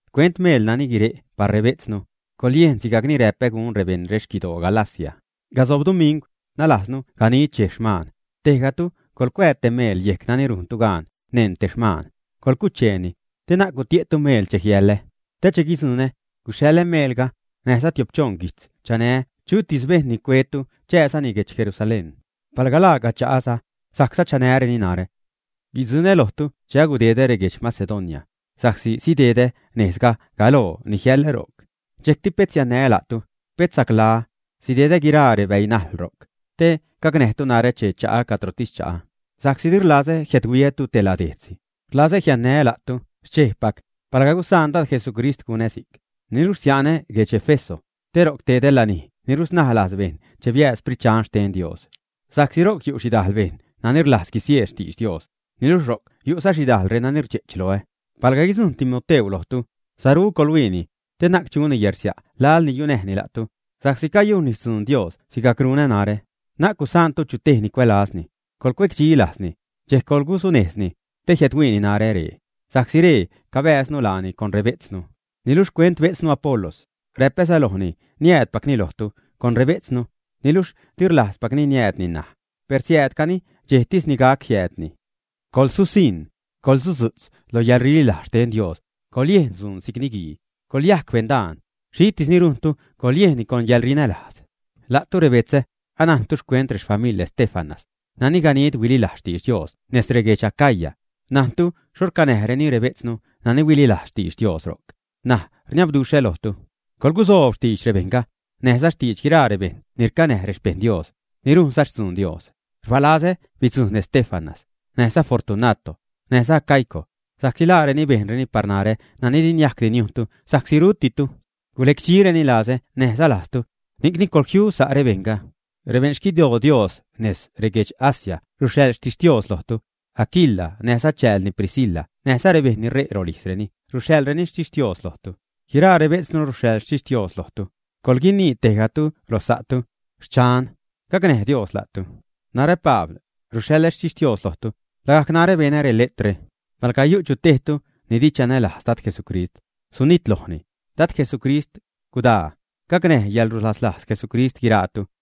Xcuent meel nani guire' par rebejtznu, coḻyejnni sigajcni räpä gun rebeṉ rexquidoo Galacia. Casob dumingw, nalajznu ganid dxej xmaan, tejgatu coḻcuää te meel yejc nani rujntu gaan neṉ te xmaan, coḻcucheeni, te na'c gutie'tu meel che jiälä. Te che guidzuṉä, guxhaḻä meelga, näjza tiop-choṉ guijtz chanä chutis bejṉ ni cuetu chasa'nni guedx Jerusalén. Palga laaca cha'aza, sajcza chänäreni narä. Guidzuṉä lojtu che agudedä reguedx Macedonia, sa'csi sidedä nejzga galoo ni jiälä ro'c. Dxejcti pet siannää́ la'tu, pet saclaä, sidedä guiraa rebäi najl ro'c, te gacnäjtu narä che cha'a cadrotis cha'a. Sa'csi di rlazä jiädhuiätu te ladejtzsi, rlazä jiannää́ la'tu xchejpac, palga gusaan Dad Jesucrist gunä si'c. Niluxh sia'nä guedx Éfeso, te ro'c tedä lanij ni rusnaj lajz bejṉ che biääd Sprit Dxan xten Dios. Sa'csi ro'c yu' xhidajl bejṉ nani rlajz guisieed xtidx Dios, niluxh ro'c yu'za xhidajl reni rdxe'ch loä. Palga guidzujṉ Timoteu lojtu, saru coḻhuiini, te na'c chuni yärsia' laḻ ni yunäjni la'tu, sa'csi cayujnni xtzuun Dios sigajc runä narä. Na'c gusaantu chu tej ni cuälazni, coḻcuecdxi lajzni, dxejc coḻgusunejzni, te jiädhuiini narä ree, sa'csi ree cabääznu laani con rebejtznu. Niluxh xcuent bejtznu Apolos, räpäza lojni niäädpacni lojtu con rebejtznu, niluxh di rlajzpacni niäädni ṉaj. Per siäädcani dxejtis ni gac jiäädni. Coḻsusiṉ, coḻsudzu'tz lo yäḻrililajz xten Dios, coḻyejn dzuun si'c niguii, coḻyajc beṉdaan. Xhitis ni rujntu coḻyejnni con yäḻrinälajz. La'tu rebetzä, anajntu xcuent rexfamiḻ Estéfanas, nani ganid huililajz xtidx Dios nez reguedx Acaya, najntu xho racnäduxhreni rebejtznu nani huililajz xtidx Dios ro'c. N̲aj rniabduxhä lojtu, coḻgusoob xtidx rebejṉga, näjza xtidx guiraa rebejṉ ni racnäj rexpejṉ Dios, ni rujnza xtzuun Dios. Rbalazä bidzujṉ Estéfanas, näjza Fortunato, näjza Acaico, sa'csi laareni bejnreni par narä nani di niajcdi niujntu sa'csi rutitu. Gulecdxireni lazä näjza lajztu, ni'cni, ¡coḻjiu sa' rebejṉga! Rebeṉ xquidoo Dios nez reguedx Asia ruxhaḻ xtixtios lojtu. Aquila näjza chäälni Priscila näjza rebejṉ ni ṟe' rolijzreni ruxhaḻzareni xtixtios lojtu. Guiraa rebejtznu ruxhaḻ xtixtios lojtu. Coḻguinii tejgatu lo sa'tu: “Xchan, gacnäj Dios la'tu.” Narä Pabl, ruxhaḻä xtixtios lojtu, lagajc narä benä reletrre. Palga yu' chu tejtu ni di chanälajz Dad Jesucrist, sunitlojni. ¡Dad Jesucrist, gudaa! Gacnäj xcäḻrulaslajz Jesucrist guiraatu.